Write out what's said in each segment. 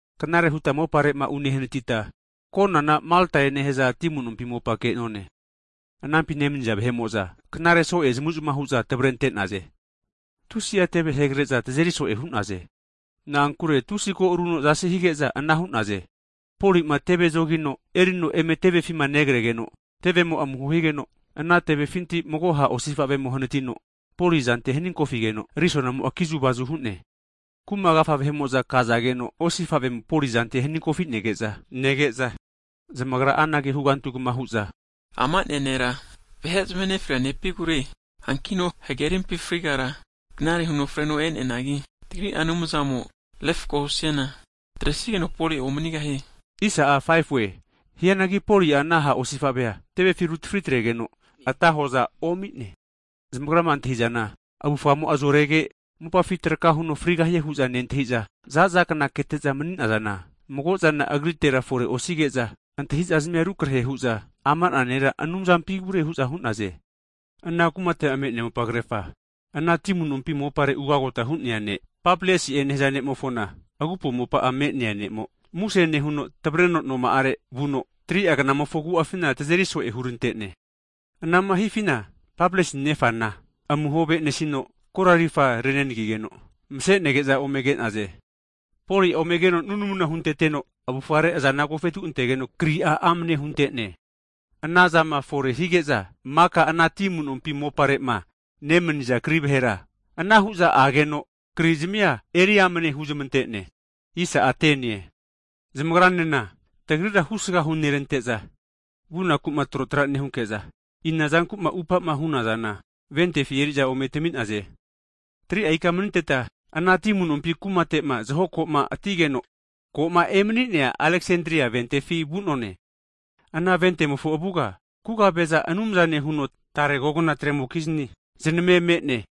Knare huta mopare'ma unehanatita konana Maltae nehaza ti amu'nompi mopa ke'none. Anampima nemaniza vahe'mo'za knare so'e zamavu'zamava hu'za tavarente'naze. Tusi'a teve hegare'za tazeri so'e hu'naze na'ankure, tusi ko'aruno zasi hige'za ana hu'naze. Poli'ma teve zogino erino eme tevefima negregeno, tevemo'a amuho higeno ana tevefinti mago ha' osifa'vemo hanatino Poli azante haninkofigeno, arisonamo'a kizu'vazu hu'ne. Kuma agafa vahe'mo'za kazageno osifa'vemo Poli azante haninkofi nege'za, zamagra'a anage hugantugma hu'za, ama'na nera vahe zamahe nefria nepigure, hankino hagerimpi frigara knare huno freno e'neanagi, tagri'ma refko'ma nehia a' anumzamo refako husiana atre'sigeno Poli'a omanigahie. Hianagi Poli'a ana ha' osifavea tevefi rutafri atregeno ata hoza omi'ne. Zamagra'ma antahi'zana, avufamo'a zorege mopafi traka huno frigahie hu'za nentahi'za, za'za kna kete'za mani'zana, mago'zana agritera fore osige'za, antahizazmia rukarehe hu'za ama'na nera anumzampigure hu'za hu'naze. Ana kumate'ma me'nea mopagerfa, ana ti amu'nompi mopare ugagota hu'nea ne' Pabliasi'e nehaza ne'mofona, agupo mopa'a me'nea ne'mo, muse nehuno tavareno noma'are vuno, 3'a kna'mofo agu'afina tazeri so'e hurante'ne. Anama hifina Pabliusi nefana amuho ave'nesino korarifa renagigeno vase'nege'za ome ke'naze. Poli'a omegeno nunamu hunteteno, avufare azana agofetu antegeno, kri'a amane hunte'ne. Anazama fore hige'za, maka ana ti amu'nompi mopare'ma nemaniza kri vahera anahu'za ageno kri'zamia eri amane huzmante'ne. Hagi zamagranena, tagrira husga hunerante'za, vunaku'ma trotra nehunke'za, ina zanku'ma atupa'ma hu'nazana ventefi eri'za ome tami'naze. Hagi 3'a ika maniteta, ana ti amunompi kumate'ma zaho ko'ma atigeno ko'ma emani'nea Aleksandria ventefi vu'none. Ana ventemofo avuga kugaveza anumzane huno tare kogna tremokizni znamema'a me'ne.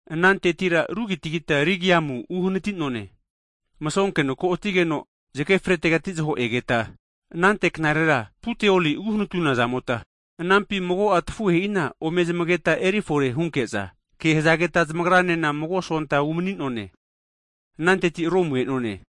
Anantetira rugagita Regiumu uhanati'none. Masonkeno ko'atigeno zage fretegati zaho egeta anagame'a mago knarera Puteoli uhanatuna zamota, anampi mago'a tafuhe'ina ome zamageta erifore hunke'za, ke hazageta zamagranena mago sonta umani'none. Ananteti Romu e'none.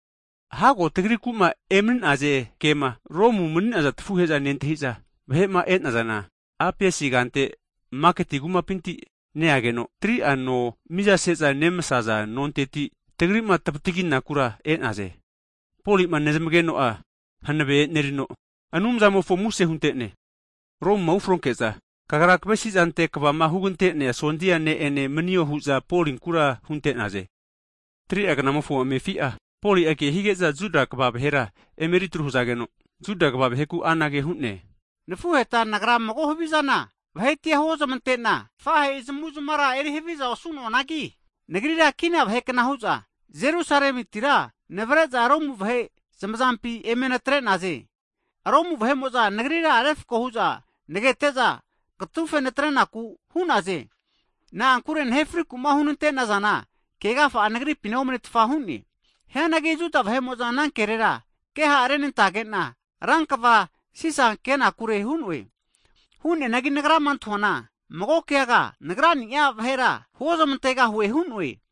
Hago tagriku'ma emani'naze kema Romu mani'naza tafuhe'za nentahi'za vahe'ma e'nazana, Apiusi kante maketi kumapinti neageno, 3'a no mizase'za nemasaza nonteti tagri'ma tavataginakura e'naze. Poli'ma nezmageno'a hanave e'nerino, Anumzamofo muse hunte'ne. Romuma ufronke'za, kagra kavesi'zante kvama hugante'nia sondia ne'ene manio hu'za Polinkura hunte'naze. Hagi 3'a gna'mofo amefi'a, Poli'a kehige'za Juda kva vahera emeritru hazageno, Juda kva vaheku anage hu'ne, Nafuheta nagra mago havizana vahetia huozmante'na tafahe'i zamu'zmara eri haviza osu'noanagi, nagrira kina vahekna hu'za Jerusalemitira navare'za Romu vahe zamazampi eme natre'naze. Romu vahe'mo'za nagrira refko hu'za nagete'za, katufe natrenaku hu'naze. Na'ankure nahe friku'ma hunantazana, kegafa'a nagripina omanetfa hu'ne. Hianagi Juda vahe'mo'za ana kerera ke ha' renantage'na, rankva Sisa kenakure hu'noe. Hu'neanagi nagrama antahuana mago keaga nagra'ni'a vahera huozmantegahue hu'noe.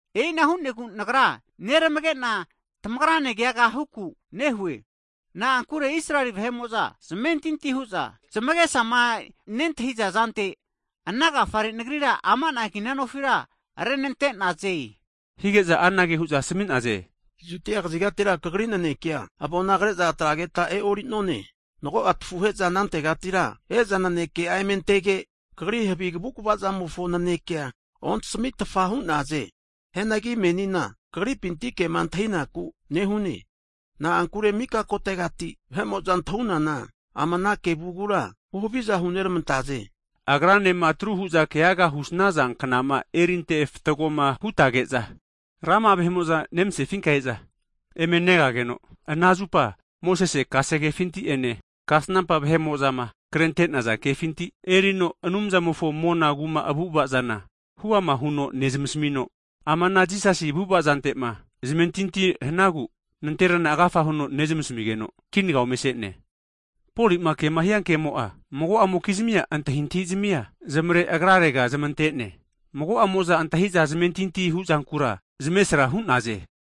E'ina hu'negu nagra neramage'na tamagra ne keaga huku nehue. Na'ankure Israeli vahe'mo'za zamentinti hu'za, zamage'sama nentahiza zante ana agafare nagrira ama'na kina nofira renante'naze. Hige'za anage hu'za asami'naze, Judia kazigatira kagri nanekea avona kre'za atrageta e'ori'none. Hanki tafuhe'za anantegatira e'za naneke'a eme antege, kagri havi kavukva zamofo nanekea ontasmitfa hu'naze. Hianagi menina kagripinti kema antahinaku nehune, na'ankure mika kotegati vahe'mo'za antahu'nana ama ana kevugura (sekt) huhaviza huneramantaze. Agranema atru hu'za keaga husnaza knama erinte fatgoma hutage'za, rama'a vahe'mo'za nemasefinka e'za eme negageno, ana zupa Mosese kasegefinti'ene kasnampa vahe'mo'zama krente'naza kefinti erino Anumzamofo mona kuma avu'ava zana huama huno nezmasmino, ama ana Jisasi avu'ava zante'ma zamentinti hanagu nanterana agafa huno nezmasmigeno kinaga ome ase'ne. Poli'ma kema hia kemo'a mago'amokizmia antahintahi zmia zamare agrarega zamante'ne, mago'amo'za antahi'za zamentinti huzankura zamesra hu'naze.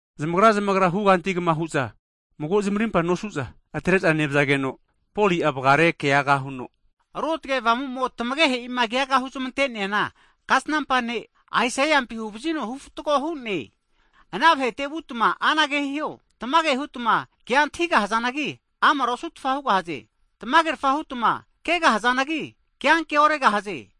Zamagra zamagra hugantigma hu'za mago zamarimpa nosu'za, atre'za nevazageno, Poli'a vagare keaga huno, Ruotge Avamu'mo tamagehe'ima keaga huzami'neana, kasnampa ne' Aisaiampi huvazino hufatgo hu'ne. Ana vahete vunka anage huo, Tamage hutma kea antahigahazanagi, amara osu'tfaza hugahaze, tamagerafa hutma kegahazanagi, keanke oregahaze.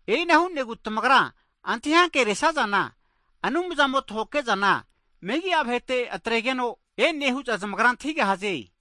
E'ina hu'negu tamagra antahi ankeresazana, Anumzamo tahokehe'zana megi'a vahete atregeno e'ne hu'za zamagra antahigahaze.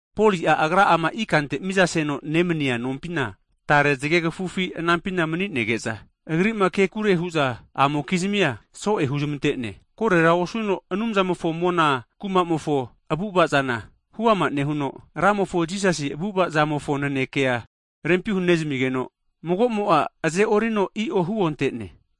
Poli'a, agra'ama ikante mizaseno ne'mania nompina, tare zagegafufi anampina mani'nege'za, agri'ma kekure hu'za amokizmia so'e huzmante'ne. Korera osuno Anumzamofo mona kumamofo avu'ava zana hu'ama nehuno, Ramofo Jisasi avu'ava zamofo nanekea rempi hunezamigeno mago'mo'a aze'orino i'o huonte'ne.